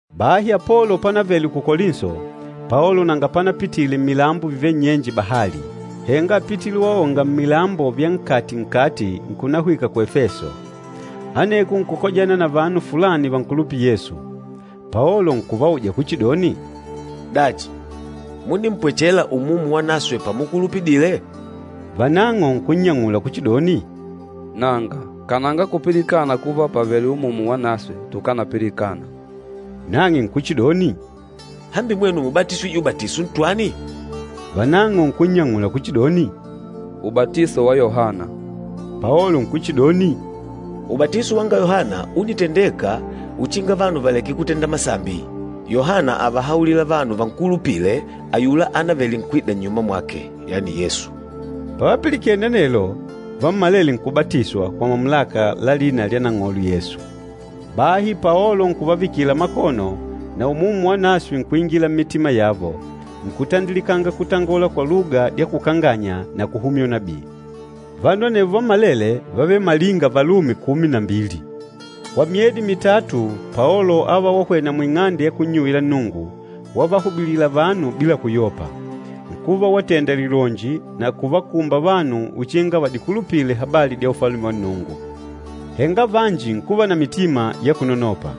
Bahi Apolo panavele ku Kolinso, Paolo nanga panapitile mmilambo vivêle nnyenje bahali, henga ápitile waonga mmilambo vya nkati-nkati nkunahwika ku Efeso. Aneko nkukojana na vanu fulani vankulupîla Yesu, Paolo nkuvauja kuchidoni, “Dachi, múnimpwechela Umumu Wanaswe pamukulupidile?” Vanang'o nkunnyang'ula kuchidoni, “Nanga, kananga kupilikana kuva pàvele Umumu Wanaswe tukánapilikana.” Nang'e nkuchidoni, “Hambi mwenu múbatiswije ubatiso ntwani?” Vanang'o nkunnyang'ula kuchidoni, “Ubatiso wa Yohana.” Paolo nkuchidoni, “Ubatiso wanga Yohana únitendeka uchinga vanu valeke kutenda masambi. Yohana ávahaulila vanu vankulupile ayula anavele nkwida nnyuma mwake, yani Yesu.” Pavapilikene anelo, vammalele nkubatiswa kwa mamulaka la lina lya Nang'olo Yesu. Bahi Paolo nkuvavikila makono, na Umumu Wanaswe nkuingila mmitima yavo, nkutandilikanga kutangola kwa luga dya kukanganya na kuhumya unabii. Vanu anevo vammalele vávele malinga valume kumi na mbili. Kwa myedi mitatu Paolo áva wahwena muing'ande ya kunnyuwila Nnungu, wavahubilila vanu bila kuyopa. Nkuva watenda lilonji na kuvakumba vanu uchinga vadikulupile habali dya Ufalume wa Nnungu. Henga vanji nkuva na mitima ya kunonopa,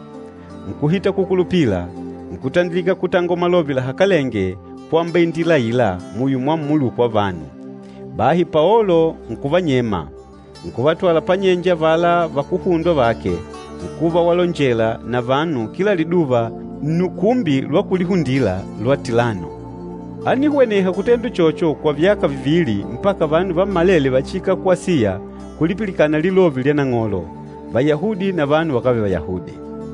nkuhita kukulupila, nkutandilika kutangola malove lahakalenge kwamba Indila Aila muyo mwa mmuluku wa vanu. Bahi Paolo nkuvanyema, nkuvatwala panyenje avala vakuhundwa vake, nkuva walonjela na vanu kila liduva nnukumbi lwa kulihundila lwa Tilano. Ánihweneha kutenda uchocho kwa vyaka vivili mpaka vanu vammalele vachiikâla ku Asiya kulipilikana lilove lya Nang'olo, Vayahudi na vanu vakávele Vayahudi.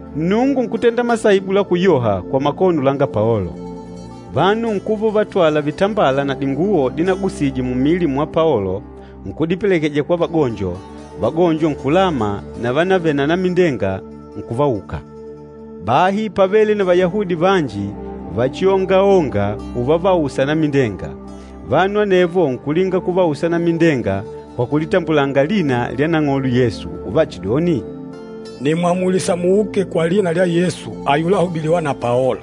Nnungu nkutenda masaibu la kuyoha kwa makono langa Paolo. Vanu nkuva uvatwala vitambala na dinguwo dinagusije mummili mwa Paolo, nkudipelekeja kwa vagonjo, vagonjo nkulama na vanavele na anamindenga nkuvauka. Bahi pávele na Vayahudi vanji vachionga-ônga uvavausa anamindenga, vanu anevo nkulinga kuvausa anamindenga kwa kulitambulanga lina lya Nang'olo Yesu, uvachidoni, “Nìmwamulisa muuke kwa lina lya Yesu ayula ahubilîwa na Paolo.”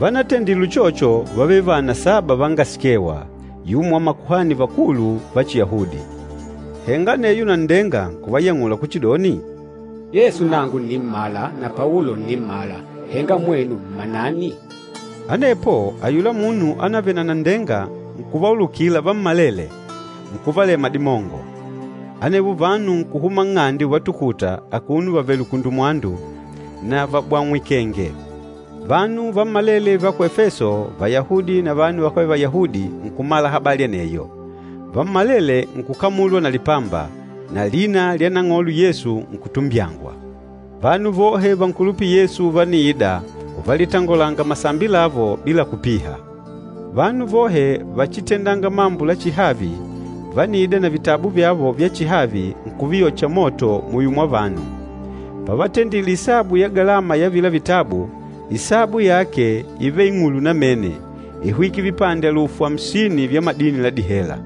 Vanatendile uchocho vávele vana saba vanga Skewa, yumo wa makuhani vakulu va Chiyahudi. Henga aneyo nanndenga nkuvayang'ula kuchidoni, “Yesu nangu ǹnimmala na Paolo ǹnimmala, henga mwenu mmanani?” Anepo ayula munu anavele na nanndenga nkuvaulukila vammalele, nkuvalema dimongo. Anevo vanu nkuhuma nng'ande uvatukuta akuno vavèlè lukundumwandu na vabwang'wikenge. Vanu vammalele va ku Efeso, Vayahudi na vanu vakávele Vayahudi nkumala habali aneyo. Vammalele nkukamulwa na lipamba, na lina lya Nang'olo Yesu nkutumbyangwa. Vanu vohe vankulupîla Yesu vániida, uvalitangolanga masambi lavo bila kupiha. Vanu vohe vachitendanga mambo la chihavi vániida na vitabu vyavo vya chihavi nkuviyocha moto muyo mwa vanu. Pavatendile isabu ya galama ya avila vitabu, isabu yake ívele ing'ulu namene, íhwikila vipande alufu amsini vya madini la dihela.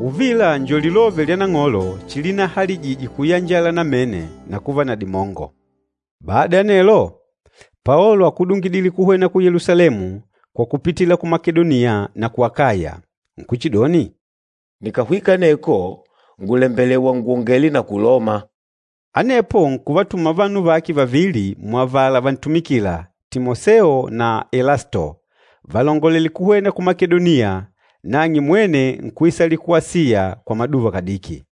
Uvila njo Lilove lya Nang'olo chilinahalijije kuyanjala namene na kuva na dimongo. Bada ya anelo, Paolo ákudungidile kuhwena ku Yelusalemu kwa kupitila ku Makedoniya na ku Akaya. Nkuchidoni, “Nikàhwika aneko, ngùlembelewa ngwòngele na ku Loma.” Anepo nkuvatuma vanu vake vavili muavala vantumikîla, Timoseo na Elasto, valongolele kuhwena ku Makedoniya, nang'e mwene nkuisalila ku Asiya kwa maduva kadiki.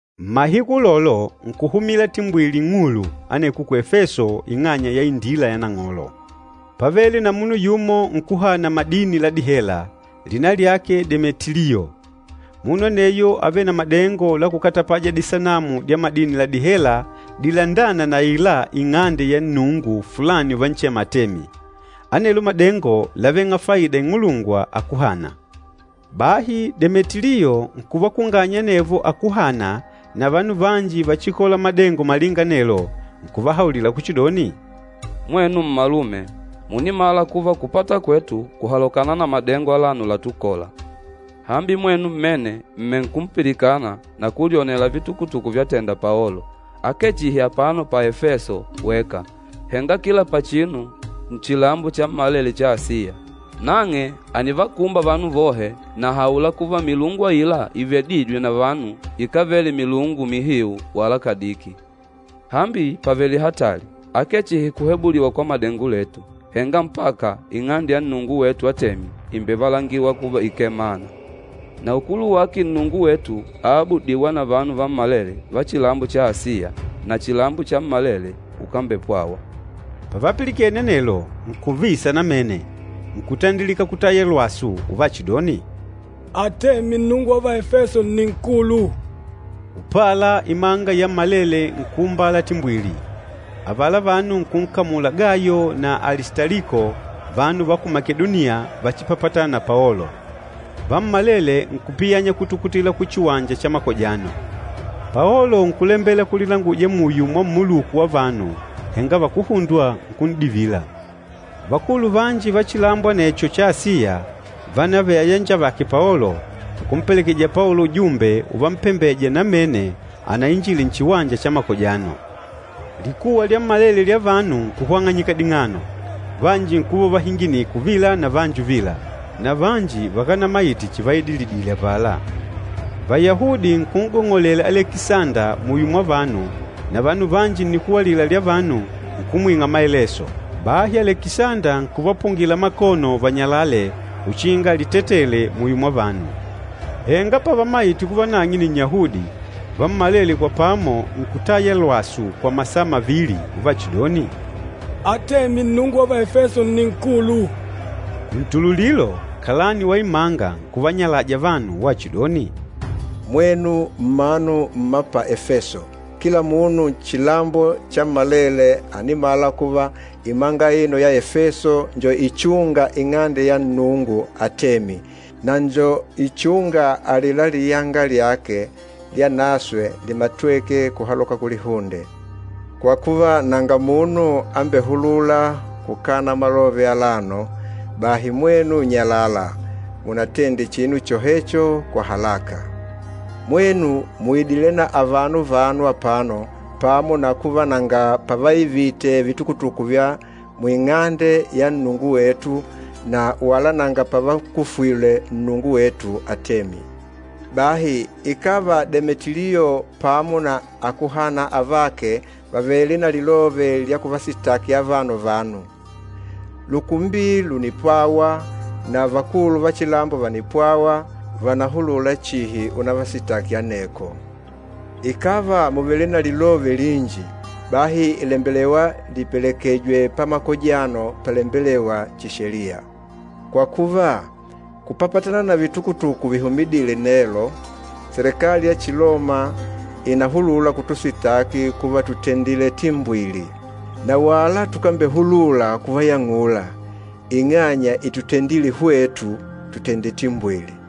Mmahiku ulolo nkuhumila timbwili ing'ulu aneko ku Efeso ing'anya ya Indila ya Nang'olo. Pávele na munu yumo nkúhana madini la dihela, lina lyake Demetiliyo. Munu aneyo ávele na madengo la kukatapaja disanamu dya madini la dihela dilandâna na aila ing'ande ya nnungu fulani uvanchema Atemi. Anelo madengo láveng'a faida ing'ulungwa akúhana. Bahi Demetiliyo nkuvakunganya anevo akúhana na vanu vanji vachikôla madengo malinga anelo, nkuvahaulila kuchidoni, “Mwenu mmalume, mùnimala kuva kupata kwetu kuhalokana na madengo alano latukôla. Hambi mwenu mmene m̀menkupilikana na kulyonela vitukutuku vyatenda Paolo, akee chihi apano pa Efeso weka, henga kila pachinu nchilambo chammalele cha Asiya. Nang'e ànivakumba vanu vohe na àhaula kuva milungu aila ivedwîje na vanu ikávele milungu mihiu wala kadiki. Hambi pàvele hatali, akee chihi kuhebuliwa kwa madengo letu, henga mpaka ing'ande ya nnungu wetu Atemi ìmbevalangiwa kuva ikee mana. Na ukulu wake nnungu wetu aabudîwa na vanu vammalele va chilambo cha Asiya na chilambo chammalele, ukambepwawa.” Pavapilikene anelo, nkuvisa namene, nkutandilika kutaya lwasu uvachidoni, “Atemi nnungu wa Vaefeso nni nkulu!” Upala imanga yammalele nkuumbala timbwili. Avala vanu nkunkamula Gayo na Alistaliko vanu va ku Makedoniya vachipapatâna na Paolo. Vammalele nkupiyanya kutukutila kuchiwanja cha makojano. Paolo nkulembela kulilanguja muyo mwa mmuluku wa vanu, henga vakuhundwa nkun'divila. Vakulu vanji va chilambo anecho cha Asiya, vanavele ayanjavake Paolo, nkupelekejija Paolo ujumbe uvampembeja namene anainjile nchiwanja cha makojano. Likuwa lyammalele lya vanu nkuhwang'anyika ding'ano, vanji nkuva uvahinginika uvila na vanji uvila, na vanji vakanamaite chivaidilidile apala. Vayahudi nkun'gong'olela Alekisanda muyo mwa vanu, na vanu vanji nnikuwa alila lya vanu nkumwing'a maeleso. Bahi Alekisanda nkuvapungila makono vanyalale uchinga alitetele muyo mwa vanu. Henga pavamaite kuva nang'e nni Nnyahudi, vammalele kwa pamo nkutaya lwasu kwa masaa mavili uvachidoni, “Atemi nnungu wa Vaefeso nni nkulu!” Kuntululilo, kalani wa imanga nkuvanyalaja vanu wachidoni, “Mwenu mmanu mma pa Efeso kila munu nchilambo chammalele ànimala kuva imanga aino ya Efeso njo ichûnga ing'ande ya nnungu Atemi na njo ichûnga alila liyanga lyake lyanaswe limatwêke kuhaloka kulihunde. Kwa kuva, nanga munu ambehulûla kukana malove alano, bahi mwenu nyalala, munatende chinu chohecho kwa halaka. Mwenu mùidile na avano vanu apano pamo na kuva nanga pavaivite vitukutuku vya muing'ande ya nnungu wetu na wala nanga pavankufwile nnungu wetu Atemi. Bahi ikàva Demetiliyo pamo na akúhana avake vàvele na lilove lya kuvasitaki avano vanu, lukumbi lùnipwawa na vakulu va chilambo vànipwawa, vanahulûla chihi unavasitaki aneko. Ikàva mùvele na lilove linji, bahi ìlembelewa lipelekejwe pamakojano palembelewa chisheliya. Kwa kuva, kupapatana na vitukutuku vihumidîle nelo, selekali ya Chiloma ìnahulula kutusitaki kuva tùtendile timbwili. Na wala tukambehulula kuvayang'ula, ing'anya itutendîle hwetu tutende timbwili.”